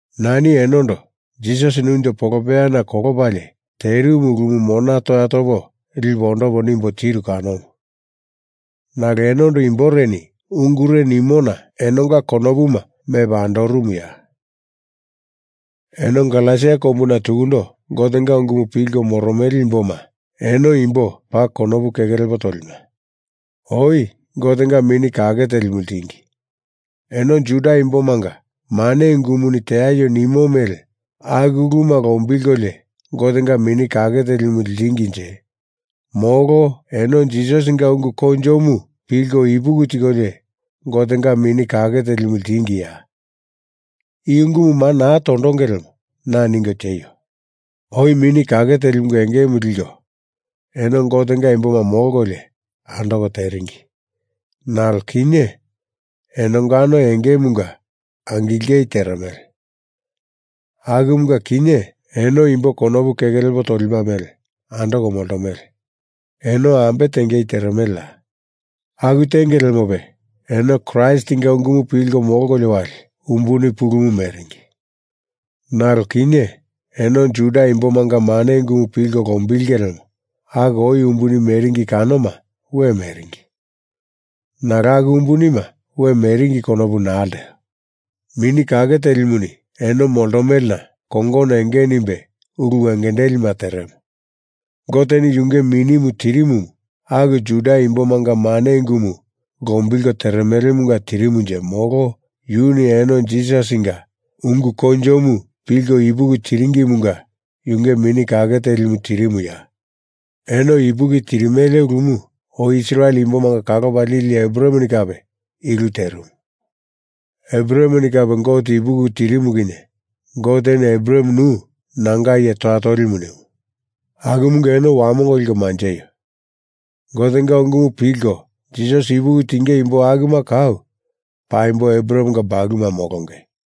Nani enondo Jisasini unjo polopeyana kolopalie terimu ulumu mona toya topo lipo ondopo nimbo tiru kanomu. Nalo enondo imboreni ungure nimona enonga konopuma mepa andorumuya? Eno Galesia kombuna tukundo Gotenga ungumu pilko moromele imboma eno imbo paa konopu keke lepo tolima. Oi Gotenga Mini Kake Telimu ltingi. Eno Juda imbomanga mane ungumuni teaio nimo mele aku uluma lombilkolio Gotenga Mini Kake telimu ltinginje molo eno Jisasinga ungu koinjomu pilko ipuki tikolio Gotenga Mini Kake Telimu ltingiya? I ungumu maa naa tondonge lemo na ningo tieio. Oi Mini Kake Telimunga engemu liko eno Gotenga imboma molkolio andoko teringi. Nalo kinye enongano engemunga angilengei teremele. Akumunga kinye eno imbo konopu keke lepo tolima mele andoko moltomele. Eno ambe tengei teremeleya! Aku tenge lemope eno Kraistinga ungumu pilko molkolio wali umbuni pulumu meringi. Nalo kinye eno Juda imbomanga mane ungumu pilko lombilenge lemo aku oi umbuni meringi kanoma we meringi. Nalo aku umbunima we meringi konopu naa lteo. Mini Kake Telimuni eno moltomelena kongono enge nimbe ulu wengendelima teremo. Goteni yunge Minimu tirimumu aku Juda imbomanga mane ungumu lombilko teremelemunga tirimunje molo yuni eno Jisasinga ungu koinjomu pilko ipuki tiringimunga yunge Mini Kake Telimu tirimuya? Eno ipuki tirimele ulumu oi Israel imbomanga kalopa lili Abrahameni kape i ulu terimu. Abrahameni kape Gote ipuki tirimu kinye Goteni Abraham nu nanga iye toya tolimu nimu. Akumunga eno wamongo liko manjeio. Gotenga ungumu pilko Jisasi ipuki tinge imbo akuma kau paimbo Abrahamenga bakuluma molonge.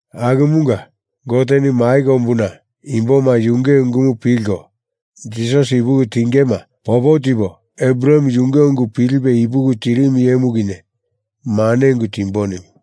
Akumunga Goteni mai kombuna imboma yunge ungumu pilko Jisasi ipuki tingema popo tipo Abraham yunge ungu pilipe ipuki tirimu iyemu kinye mane ungu timbo nimu.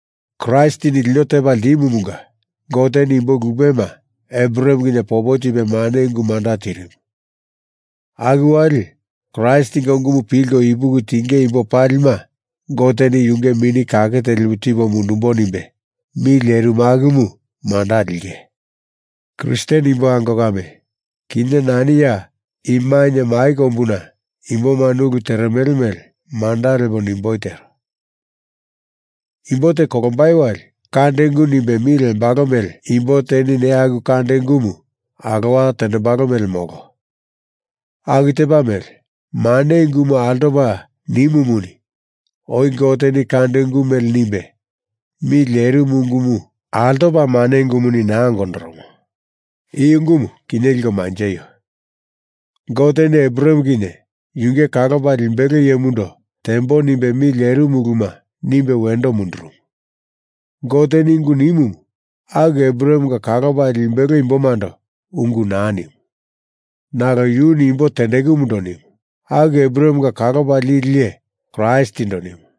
Kraistini lino tepa ltimumunga Goteni imbo lupema Abraham kinye popo tipe mane ungu manda tirimu. Aku wali Kraistinga ungumu pilko ipuki tinge imbo palima Goteni yunge Mini Kake Telimu tipo mundumbo nimbe mi lerimu akumu manda linge. Kristen imbo ango kame, kinye nani ya i mainye mai kombuna imbomani ulu teremele mele manda lepo nimboi tero. Imbo te kolombai wali kande ungu nimbe mi lembalo mele imbo teni neya aku kande ungumu alowa tendembalo mele molo. Aku tepa mele mane ungumu altopa nimumuni oi Goteni kande ungu mele nimbe mi lerimu ungumu altopa mane ungumuni naa ongondoromo. I ungumu kinye liko manjeio. Goteni Abraham kinye yunge kalopa limbelo iyemundo tembo nimbe mi lerimu uluma nimbe wendo mundurumu. Goteni ungu nimumu aku Abrahamenga kalopa limbelo imbomando ungu naa nimu. Nalo yuni imbo tendekumundo nimu. Aku Abrahamenga kalopa lili iye Kraistindo nimu.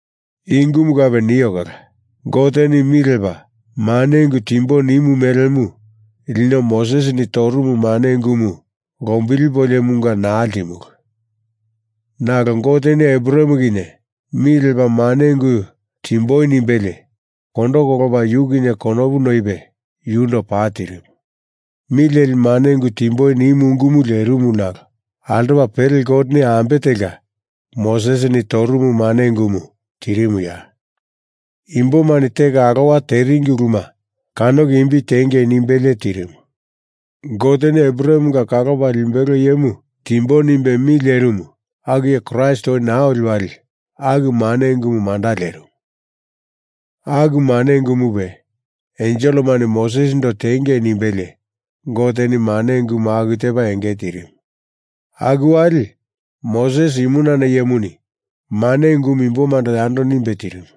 I ungumu kape nio kala Goteni mi lepa mane ungu timbo nimu melemu lino Mosesini torumu mane ungumu lombilipoliomunga naa ltimulu. Nalo Goteni Abraham kinye mi lepa mane ungu timboi nimbelie kondo kolopa yu kinye konopu noipe yundo paa tirimu. Mi leli mane ungu timboi nimu ungumu lerimu nalo altopa pele Goteni ambe telka Mosesini torumu mane ungumu tirimuya? Imbomani teko alowa teringi uluma kanoko imbi tiengei nimbelie tirimu. Goteni Abrahamenga kalopa limbelo iyemu timbo nimbe mi lerimu aku iye Kraist oi naa oli wali aku mane ungumu manda lerimu. Aku mane ungumupe enselemani Mosesindo tengei nimbelie Goteni mane ungumu aku tepa enge tirimu. Aku wali Moses imunana iyemuni mane ungumu imbomando yando nimbe tirimu.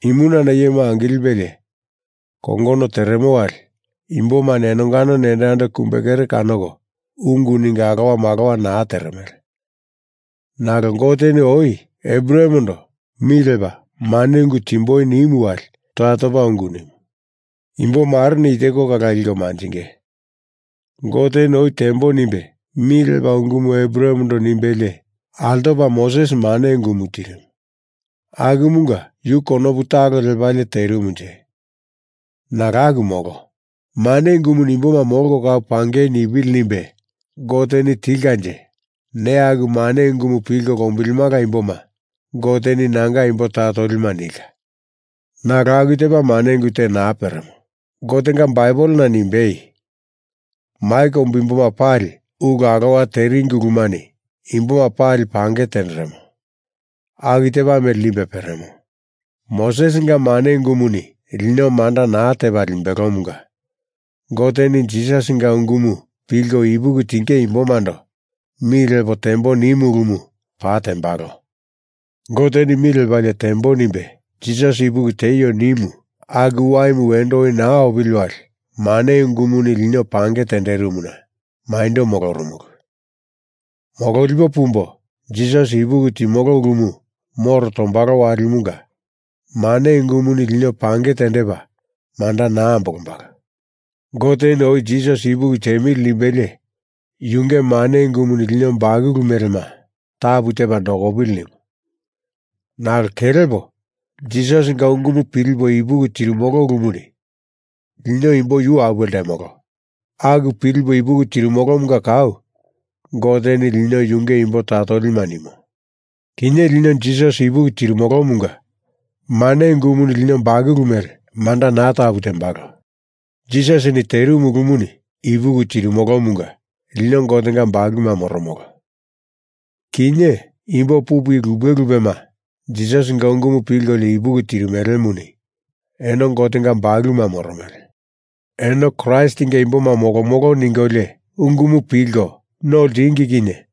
Imunana iyemu angilipelie kongono teremo wali imbomani enonga nendo yando kumbe kere kanoko ungu ningo alowa malowa naa teremele. Nalo Goteni oi Abrahamendo mi lepa mane ungu timboi nimu wali toya topa ungu nimu. Imbo mareni i teko kala liko manjinge: Goteni oi tembo nimbe mi lepa ungumu Abrahamendo nimbelie altopa Moses mane ungumu tirimu. Akumunga yu konopu talo lepalie terimunje? Nalo aku molo. mane ungumuni imboma molko kau pangei nipili nimbe Goteni tilkanje neya aku mane ungumu pilko lombilimala imboma Goteni nanga imbo toya tolima nilka. Nalo aku tepa mane ungu te naa peremo. Gotenga Baibelena nimbei, Mai kombu imboma pali ulu alowa teringi ulumani imboma pali pange tenderemo aku tepa mele nimbe peremo. Mosesinga mane ungumuni lino manda naa tembalomunga Goteni Jisasinga ungumu pilko ipuki tinge imbomando mi lepo tembo nimu ulumu paa tembalo. Goteni mi lepalie tembo nimbe Jisasi ipuki tieio nimu aku waimu wendo oi naa opili wali, mane ungumuni lino pange tenderimuna maindo molorumulu. Mololipo pumbo, Jisasi ipuki timolo ulumu moro tombalo walimunga mane ungumuni lino pange tendepa manda naa ambolombalo. Goteni oi Jisasi ipuki tiemili nimbelie yunge mane ungumuni lino bakulu melema tapu tepa nokopili nimu. Nalo kelepo Jisasinga ungumu pilipo ipuki tirimolo ulumuni lino imbo yu apuwe ltemolo. Aku pilipo ipuki tirimolomunga kau Goteni lino yunge imbo toya tolima nimo. Kinye lino Jisasi ipuki tirimolomunga mane ungumuni lino bakulu mele manda naa tapu tembalo. Jisasini terimu ulumu ipuki tirimolomunga lino Gotenga bakuluma moromolo. Kinye imbo pupu i lupe lupema Jisasinga ungumu pilkolio ipuki tirimelemuni eno Gotenga bakuluma moromele. Eno Kraistinga imboma molomolo ningolio ungumu pilko no ltingi kinye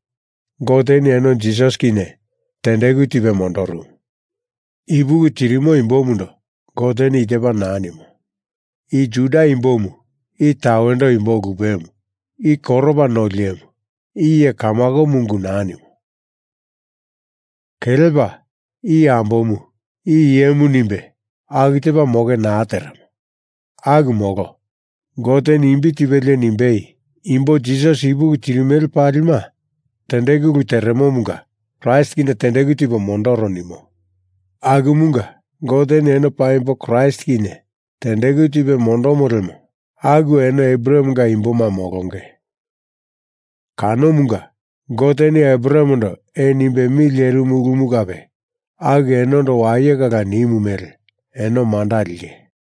Goteni eno Jisasi kinye tendeku tipe mondorumu. Ipuki tirimo imbomundo Goteni i tepa naa nimo: I Juda imbomu, i tawendo imbo lupemu. I koropa noli iyemu, i iye kamakomu ungu naa nimo. Kelepa i ambomu, i iyemu nimbe aku tepa moke naa teremo. Aku molo. Goteni imbi tipelie nimbei imbo Jisasi ipuki tirimele palima tendeku ulu teremomunga Kraist kinye tendeku tipo mondoro nimo. Akumunga Goteni eno paimbo Kraist kinye tendeku tipe mondomo lemo aku eno Abrahamenga imboma molonge. Kanomunga Goteni Abrahamendo ee nimbe mi lerimu ulumu kape aku enondo waye kala nimu mele eno manda linge.